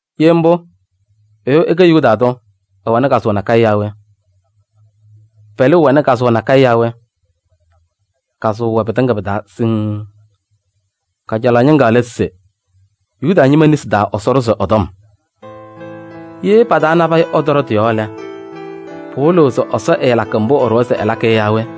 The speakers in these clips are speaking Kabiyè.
Ye mbʋ, ɛyʋ ɛkɛ Yuda tʋ, ɛwɛnɩ kazʋwa nakɛyɛ yaa we? Pɛlʋʋ ñɛwɛ wazaɣ nakɛyɛ yaa we? Kazʋwa wɛ pɩtɩŋa pɩ-taa siŋŋ. Kajalaɣ ñɩŋga lɛ se Yuda ñɩma nesi taa Ɛsɔ ɖʋzɩ ɛ-tɔm. Ye pa-taa nabɛyɛ ɛtɔɖɔ tɩ-yɔɔ lɛ, pɩwɩlɩɣ se Ɛsɔ ɛɛlakɩ mbʋ ɛɖʋwa se ɛlakɩ yɔ yaa we?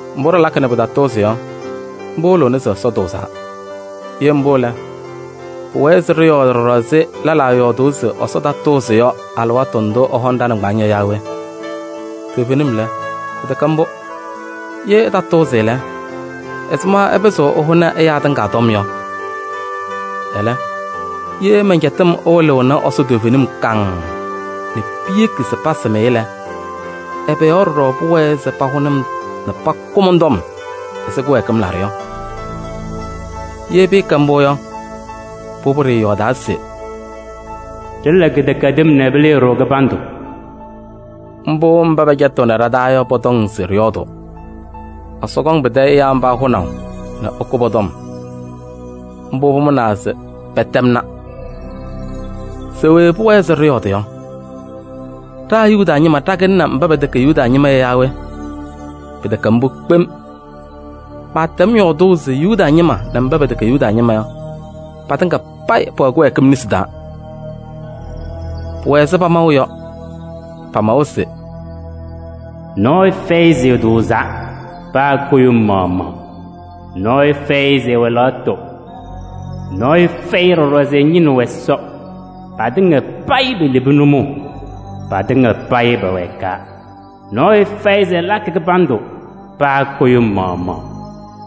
Mbʋ ɖɩlakɩ nɛ pɩtatʋʋzɩ yɔ, mbʋ wɩlɩɣnɩ se Ɛsɔ tʋʋzaa. Ye mbʋ lɛ, pʋwɛɛ se ɖɩyɔɔdɩ ɖɔɖɔ ɛzɩ lɛlaa yɔɔdʋʋ se Ɛsɔ tatʋʋzɩ yɔ alɩwaatʋ ndʋ ɛhɔŋ ɖa-nɩŋgbaaŋ yɔ yaa we? Toovenim lɛ, pɩtɛkɛ mbʋ! Ye ɛtatʋʋzɩ lɛ, ɛzɩma ɛpɩzɩɣ ɛhʋnɩ ɛyaa tɩŋa tɔm yɔ? Ɛlɛ, ye mɛn-cɛtɩm ɛwɩlɩɣnɩ Ɛsɔ toovenim kaŋŋ nɛ piyeki se pasam-ɩ lɛ, ɛbɛ yɔɔ ɖɔɖɔ pʋwɛɛ se pahʋnɩ-m nɛ pakʋ mɔn-tɔm ɛzɩ kɩwɛɛkɩm laɖʋ yɔ? Ye pɩɩkɛ mbʋ yɔ, pʋbʋ ɖɩɩyɔɔdaa se: “Ɖɩla kɩdɛkɛdɩm nɛ pɩlɩɩ-ɖʋ kɩbandʋ.” Mbʋ mba pɛcɛtɩɣnɩ ɖa-taa yɔ pɔtɔŋ se ɖɩyɔɔdʋʋ. Ɛsɔ kɔŋ pɩtɛ ɛyaa mba hʋnaʋ nɛ ɛkʋ pɔ-tɔm, mbʋ pʋmʋnaa se pɛtɛmna. Se we pʋwɛɛ se ɖɩyɔɔdɩ yɔ? Ɖa Yuda ñɩma ɖakɩlɩnɩ mba pɛtɛkɛ Yuda ñɩma yɔ yaa we? Pɩtɛkɛ mbʋ kpem! Maatɛm yɔɔdʋʋ se Yuda ñɩma nɛ mba pɛtɛkɛ Yuda ñɩma yɔ, patɩŋa payɩ pɛwɛ kɩwɛɛkɩm nesi taa. Pʋwɛ ɛzɩ pamaʋ yɔ. Pamawa se: “Nɔɔyʋ fɛyɩ se ɛtʋʋzaa, paa kʋɖʋm maɣmaɣ. Nɔɔyʋ fɛyɩ se ɛwɛ lɛɣtʋ. Nɔɔyʋ fɛyɩ ɖɔɖɔ se ɛñɩnɩɣ Ɛsɔ. Patɩŋa payɩ pelebi nʋmɔʋ, patɩŋa payɩ pɛwɛɛkaa. Nɔɔyʋ fɛyɩ se ɛlakɩ kɩbandʋ, paa kʋɖʋm maɣmaɣ.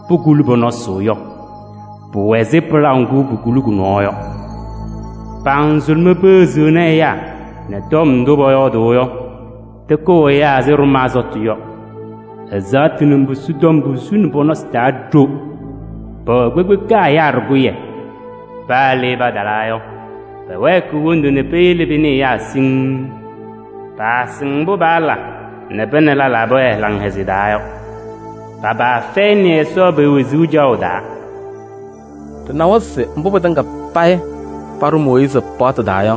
Pokuli pɔ-nɔsɩ yɔ, pʋwɛ ɛzɩ pɩlaʋ ŋgʋ pokuli kʋ-nɔɔ yɔ. Pa-nzʋlʋmɛɛ pepeɣziɣni ɛyaa nɛ tɔm ndʋ pɔyɔɔdʋʋ yɔ tɩkʋʋ ɛyaa ɛzɩ ɖʋmaa sɔtʋ yɔ. Ɛzaɣtʋ nɛ mbusu tɔm posuni pɔ-nɔsɩ taa ɖo. Pɛwɛ kpekpeka ɛyaa ɖɩkʋyɛ. Paa le patalaa yɔ, pɛwɛɛkɩɣ wondu nɛ peyele pɩnɩɩ ɛyaa siŋŋ. Paasɩŋ mbʋ paala nɛ pa nɛ lɛlaa pɛwɛɛ laŋhɛzɩyɛ taa yɔ. Pa-paa fɛyɩnɩ Ɛsɔ pe-wezuu caɣʋ taa.” Ɖɩnawa se mbʋ pɩtɩŋa payɩ paɖʋ Mooyiizi paɣtʋ taa yɔ,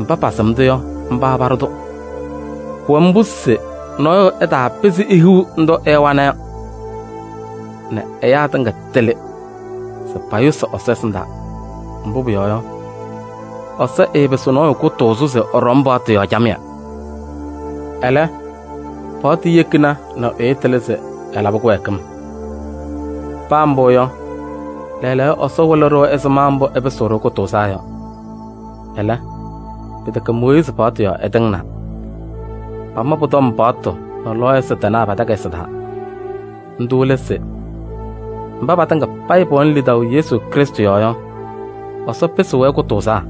mba pasɩm-tʋ yɔ, mba paɖʋ-tʋ. Pʋwɛ mbʋ se nɔɔyʋ ɛtaapɩzɩ ehiɣ ndʋ ɛwana yɔ nɛ ɛyaa tɩŋa tɩlɩ se payʋsɩ Ɛsɔ ɛsɩndaa. Mbʋ pʋyɔɔ yɔ, Ɛsɔ ɛɛpɩsɩɣ nɔɔyʋ kʋtʋʋzʋ se ɛɖɔm paɣtʋ yɔɔ camɩyɛ. Ɛlɛ, paɣtʋ yekina nɛ ɛyʋ tɩlɩ se ɛlabɩ kɩwɛɛkɩm. Paa mbʋ yɔ, lɛɛlɛɛyɔ Ɛsɔ wɩlɩ-ɖʋ ɛzɩma mbʋ ɛpɩsɩɣ-ɖʋ kʋtʋʋzaa yɔ. Ɛlɛ, pɩtɛkɛ Mooyiizi paɣtʋ yɔɔ ɛtɩŋnaa. Pama pʋ-tɔm paɣtʋ nɛ lɔɔyɩsɩ tɩnaa pa-takayɩsɩ taa. Ndʋ lɛ se: mba patɩŋa payɩ pɛwɛnɩ lidaʋ Yesu Krɩstʋ yɔɔ yɔ, Ɛsɔ pɩsɩɣ-wɛ kʋtʋʋzaa.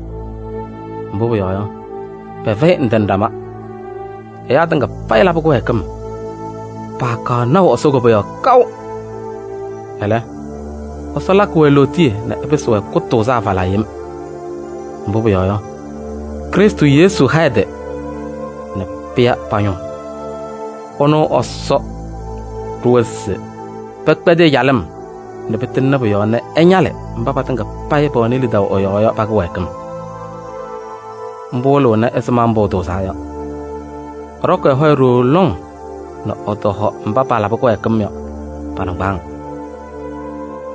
Mbʋ pʋyɔɔ yɔ, pɛfɛyɩ ndɩ nɛ ɖama: ɛyaa tɩŋa payɩ labɩ kɩwɛɛkɩm, paakaɣ naʋ Ɛsɔ koboyaɣ kaʋ. Ɛlɛ, Ɛsɔ lakɩ-wɛ lootiye nɛ ɛpɩsɩ-wɛ kʋtʋʋzaa falaa yem. Mbʋ pʋyɔɔ yɔ, Krɩstʋ Yesu ha ɛ-tɩ nɛ pɩya pa-ñʋʋ. Ɛnʋ Ɛsɔ ɖʋwa se pɛkpɛdɩ ɛ-calɩm nɛ pɩtɩŋnɩ pʋ-yɔɔ nɛ ɛñalɩ mba patɩŋa payɩ pɛwɛnɩ lidaʋ ɛ-yɔɔ yɔ, pa-kɩwɛɛkɩm. Mbʋ ɛwɩlɩnɩ ɛzɩma mbʋ ɛtʋʋzaa yɔ. Ɛɖɔkɩ ɛ-hɔyɛ ɖooo lɔŋ nɛ ɛtɔhɔ mba paalabɩ kɩwɛɛkɩm yɔ pa-nɩŋgbaaŋ.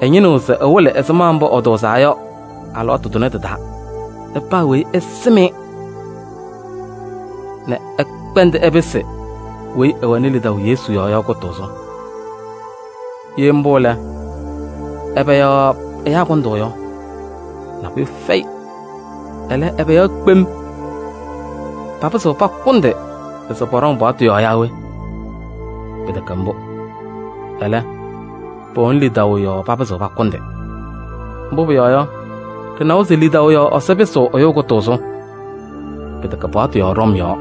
Ɛñɩnɩɣ se ɛwɩlɩ ɛzɩma mbʋ ɛtʋʋzaa yɔ alɩwaatʋ tʋnɛ tɩ-taa nɛ paa weyi ɛsɩm-ɩ mbʋ nɛ ɛkpɛndɩ ɛpɩsɩ weyi ɛwɛnɩ lidaʋ Yesu yɔɔ yɔ kʋtʋʋzʋ. Ye mbʋ lɛ, ɛbɛ yɔɔ ɛyaa kʋndʋʋ yɔ? Nabʋyʋ fɛyɩ. Ɛlɛ, ɛbɛ yɔɔ kpem? Papɩzɩɣ pakʋndɩ se pɔɖɔŋ paɣtʋ yɔɔ yaa we? Pɩtɛkɛ mbʋ! Ɛlɛ, pɛwɛnɩ lidaʋ yɔɔ papɩzɩɣ pakʋndɩ. Mbʋ pʋyɔɔ yɔ, ɖɩnawa se lidaʋ yɔɔ Ɛsɔ pɩsɩɣ ɛyʋ kʋtʋʋzʋ. Pɩtɛkɛ paɣtʋ yɔɔ ɖɔm yɔɔ.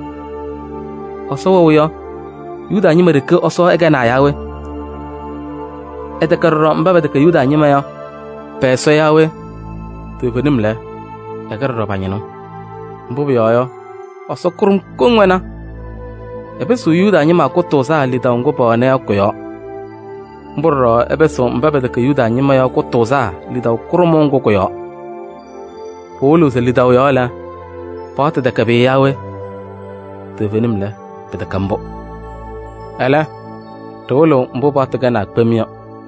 Ɛsɔ wɛʋ yɔ, Yuda ñɩma ɖeke Ɛsɔ ɛkɛnaa yaa we? Ɛtɛkɛ ɖɔɖɔ mba pɛtɛkɛ Yuda ñɩma yɔ pɛ-Ɛsɔ yaa we? Toovenim lɛ, ɛkɛ ɖɔɖɔ pa-ñɩnʋ. Mbʋ pʋyɔɔ yɔ, Ɛsɔ kʋɖʋm koŋ wɛna. Ɛpɩsɩɣ Yuda ñɩma kʋtʋʋzaa lidaʋ ŋgʋ pɛwɛna yɔ kʋ-yɔɔ. Mbʋ ɖɔɖɔ ɛpɩsɩɣ mba pɛtɛkɛ Yuda ñɩma yɔ kʋtʋʋzaa lidaʋ kʋɖʋmʋʋ ŋgʋ kʋ-yɔɔ. Pɩwɩlɩɣ se lidaʋ yɔɔ lɛ, paɣtʋ tɛkɛ pʋyʋ yaa we? Toovenim lɛ, pɩtɛkɛ mbʋ! Ɛlɛ, ɖɩwɩlɩɣ mbʋ paɣtʋ kɛnaa kpem yɔ.